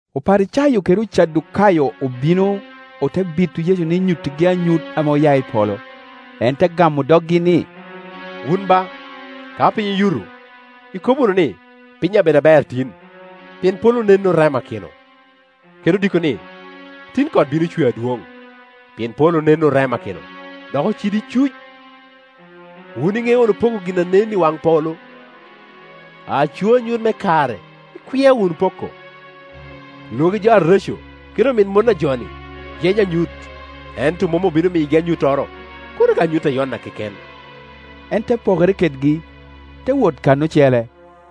Oparicayo kede Ocadukayo obino, ote bito Yecu ni nyuttigi anyut ame oya i polo. En te gamo doggi ni, “Wun ba, ka piny oyuto, ikobo wunu ni, ‘Piny abedo aber tin, pien polo nen oremakino.’ Kede odiko ni, ‘Tin kot bino cwe adwoŋ, pien polo nen oremakino, dok ocido icuc.’ Wun iŋeo wunu poko gin a nen i waŋ polo, aco anyut me kare ikwia wunu poko. Lwagi jo areco kede omit mon a jo-ni yenyo anyut, ento mom obino miyogi anyuttoro, kono ka anyut a Yona keken.” En te pokere kedgi, te wot kan ocele.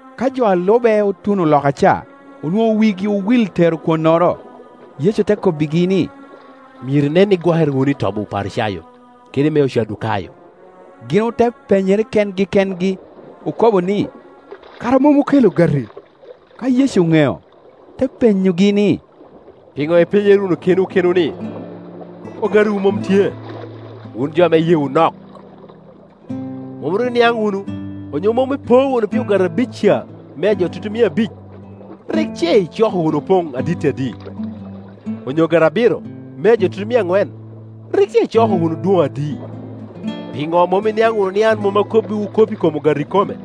Ka jo a lube otuno loka ca, onwoŋo wigi owil tero kwonnoro. Yecu te kobbigi ni, “Myero inen ni igwokere wunu i tobi Oparicayo kede i me Ocadukayo.” Gin ote penyere kengi kengi, okobo ni, “Kara mom okelo ogati.” Ka Yecu oŋeo, te penyogi ni, “Piŋo ipenyere wunu kenwu kenwu ni ogatiwu mom tye, wun jo ame iyeewu nok? Mom ru iniaŋ wunu, onyo mom ipo wunu pi ogati abic ca mea jo tutumia abic? Rik ce icoko wunu opoŋ aditti adi? Onyo ogati abiro mea jo tutumia aŋwen, rik ce icoko wunu dwoŋ adi? Piŋo mom iniaŋ wunu ni an mom akobbiwu kop i kom ogati ikome?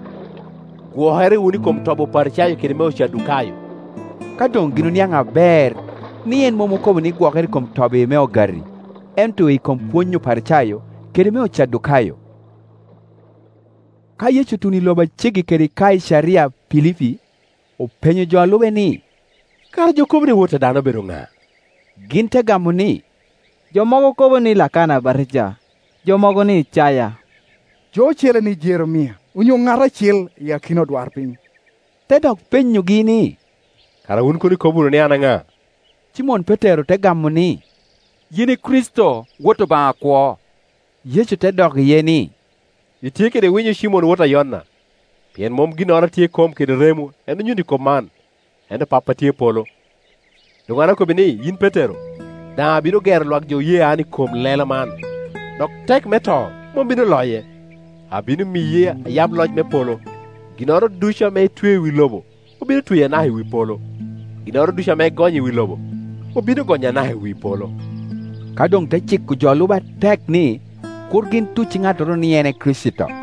Gwokere wunu i kom tobi Oparicayo kede i me Ocadukayo.” Ka doŋ gin oniaŋ aber ni en mom okobo ni gwokere i kom tobi me ogati, ento i kom pwony Oparicayo kede me Ocadukayo. Ka Yecu otuno i loba a ceggi kede Kaicaria Pilipi, openyo jo a lube ni, “Kara jo kobo ni Wot a dano obedo ŋa?” Gin te gamo ni, “Jo mogo kobo ni Lakana Abatija, jo mogo ni Icaya, jo ocele ni Jeremia, onyo ŋat acel i akina odwarpiny.” Te dok penyogi ni, “Kara wun kono ikobo wunu ni an ŋa?” Cimon Petero te gamo ni, “Yin i Kricito, Wot Obaŋa akwo.” Yecu te dok iye ni, “Itye kede winyo Cimon wota Yona! Pien mom ginnoro a tye i kom kede remo en onyutti kop man, ento Pappa a tye i polo. Doŋ an akobbi ni, yin Petero Petero te koppere lela., daŋ abino gero lwak jo oye an i kom lela man, dok tek me to mom bino loye. Abino miyi ayab loc me polo; ginnoro ducu ame itweo i wi lobo obino tweyo anaka i wi polo, ginnoro ducu ame igonyo i wi lobo obino gonyo anaka i wi polo.” Ka doŋ te ciko jo a lube atek ni, kur gin tucci ŋattoro ni en e Kricito.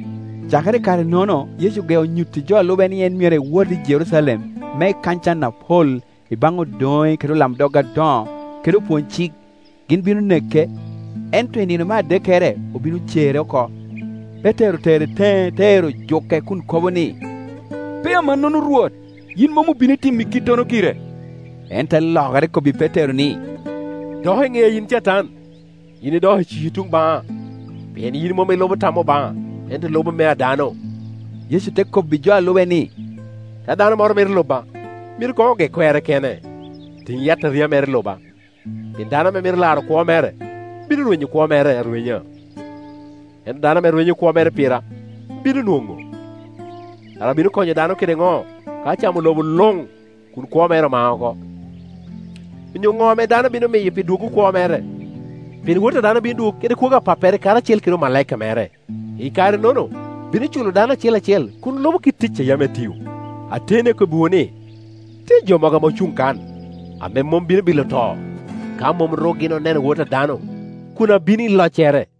Cakere i kare-nono Yecu ogeo nyutti jo a lube ni en myero ewot i Jerucalem me ekany can apol i baŋ odoŋe kede olamdog adoŋo kede opwony-cik, gin bino neke, ento i nino me adekkere obino cere oko. Petero otere teŋe te ero juke kun kobo ni, “Pe amannono, Rwot, yin mom obino timi kittono gire.” En te lokere kobbi Petero ni, “Dok i ŋea yin Catan! Yin idoko iciki tuŋ baŋa, pien yin mom ilubo tam Obaŋa, ento ilubo mea dano.” Yecu te kobbi jo a lube ni, “Ka dano moro mito luba, myero koŋ oge kwerre kene, tiŋ yataria mere, luba. Pien dano ame mito laro kwo mere, bino rwenyo kwo mere arwenya, ento dano ame rwenyo kwo mere pira, bino nwoŋo. Kara bino konyo dano kede ŋo ka ocamo lobo luŋ kun kwo mere omao oko? Onyo ŋo ame dano bino miyo pi dwoggo kwo mere? Pien Wot a dano bino dwogo kede kwogo a Pappere karacel kede omalaika mere; i kare-nono bino culo dano acel acel kun lubo kit tic a yam etio. Ateni akobbiwu ni, tye jo mogo ame ocuŋ kan ame mom bino bilo to ka mom ru gin oneno Wot a dano a kun abino i loccere.”